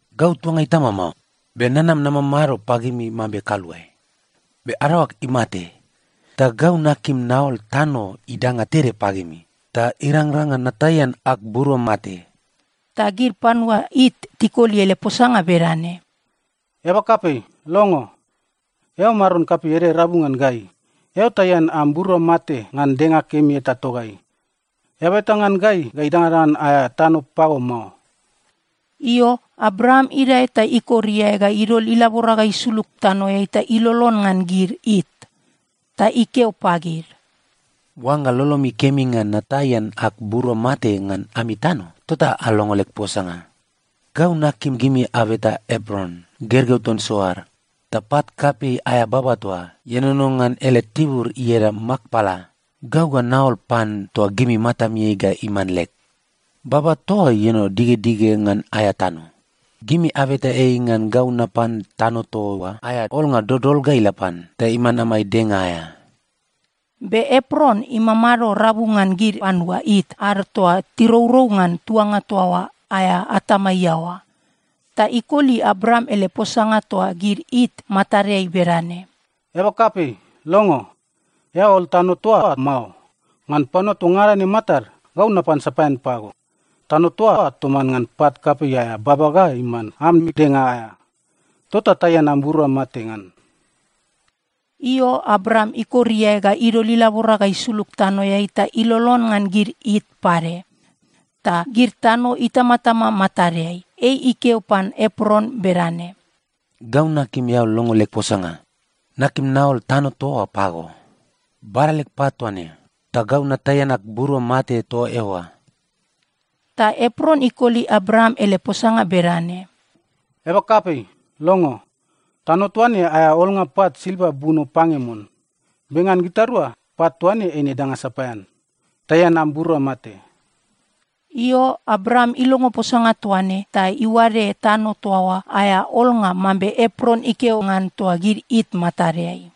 “Gau tuanga itama mao, be nanam namamado pagimi mambe kaluae. Be adaoag imate, ta gau nakim naol tano idanga tede pagimi ta irangrang ngan nataian ag burua mate.” Ta gid panua It tikoli ele posanga bedane, “Eaba kapei, longo. Eao maron kapei ede rabu ngan gai. Eao taian am burua mate ngan denga kemi eta togai. Eaba eta ngan gai ga idangadangan aea tano pago mao.” Io, Abraam idae ta ikor iae ga idol ilabora ga isulug tanoeai ta ilolon ngan gid It. Ta ikeo pagid, “Oangga lolomi kemi ngan nataian ag burua mate ngan ami tano, tota alongo leg posanga. Gau nakim gimi abeta Epron, gergeu ton Soar, ta pat kapei aea baba toa ienono ngan ele tibur ieda Makpela, gau ga naol pan toa gimi matamiai ga iman leg. Baba toa oa ienono digedige ngan aea tano. Gimi abeta ei ngan gau napan tano toa oa aea olnga dodol ga ila pan, ta iman amai denga aea.” Be Epron imamado rabu ngan gid panua It ad toa tirourou ngan tuanga toa oa aea atama iaoa. Ta ikoli Abraam ele posanga toa gid It matadeai bedane, “Eaba kapei, longo. Eao ol tano toa oa mao. Ngan panua toa ngada ne matad, gau napan sapaean pago. Tano toa oa toman ngan pat kapei aea baba ga iman ami denga aea. Tota taian am burua mate ngan.” Io, Abraam ikor iae ga idol ilabora ga isulug tanoeai ta ilolon ngan gid It pade. Ta gid tano itamatama matadeai, ei ikeo pan Epron bedane, “Gau nakim eao longo leg posanga. Nakim naol tano toa oa pago. Bada leg pat toa ne, ta gau nataian ag burua mate toa eoa.” Ta Epron ikoli Abraam ele posanga bedane, “Eaba kapei, longo. Tano toa ne aea olnga pat silva buno pange mon. Be ngan gitarua, pat toa ne eine danga sapaean. Taian am burua mate.” Io, Abraam ilongo posanga toa ne, ta iuade tano toa oa aea olnga mambe Epron ikeo ngan toa gid It matadeai.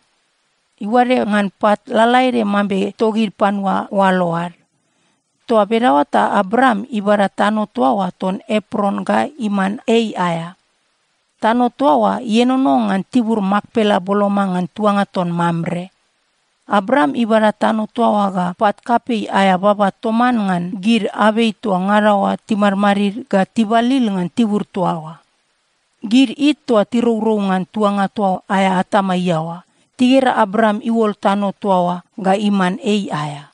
Iuade ngan pat lalaede mambe togid panua oalo ad. Toa bedaoa ta Abraam ibada tano toa oa ton Epron ga iman ei aea. Tano toa oa ienono ngan tibur Makpela boloma ngan tuanga ton Mamre. Abraam ibada tano toa oa ga pat kapei aea baba toman ngan gid abei toa ngada oa timadmadid ga tibalil ngan tibur toa oa. Gid It toa tirourou ngan tuanga toa aea atama iaoa, tigera Abraam iuol tano toa oa ga iman ei aea.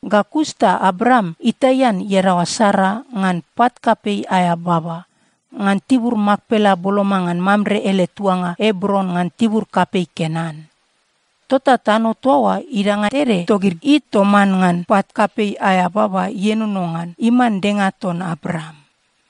Ga kus ta Abraam itaian iadaoa Sara ngan pat kapei aea baba, ngan tibur Makpela boloma ngan Mamre ele tuanga Ebron ngan tibur kapei Kenan. Tota tano toa oa idanga tede togid It toman ngan pat kapei aea baba ienono ngan, iman denga ton Abraam.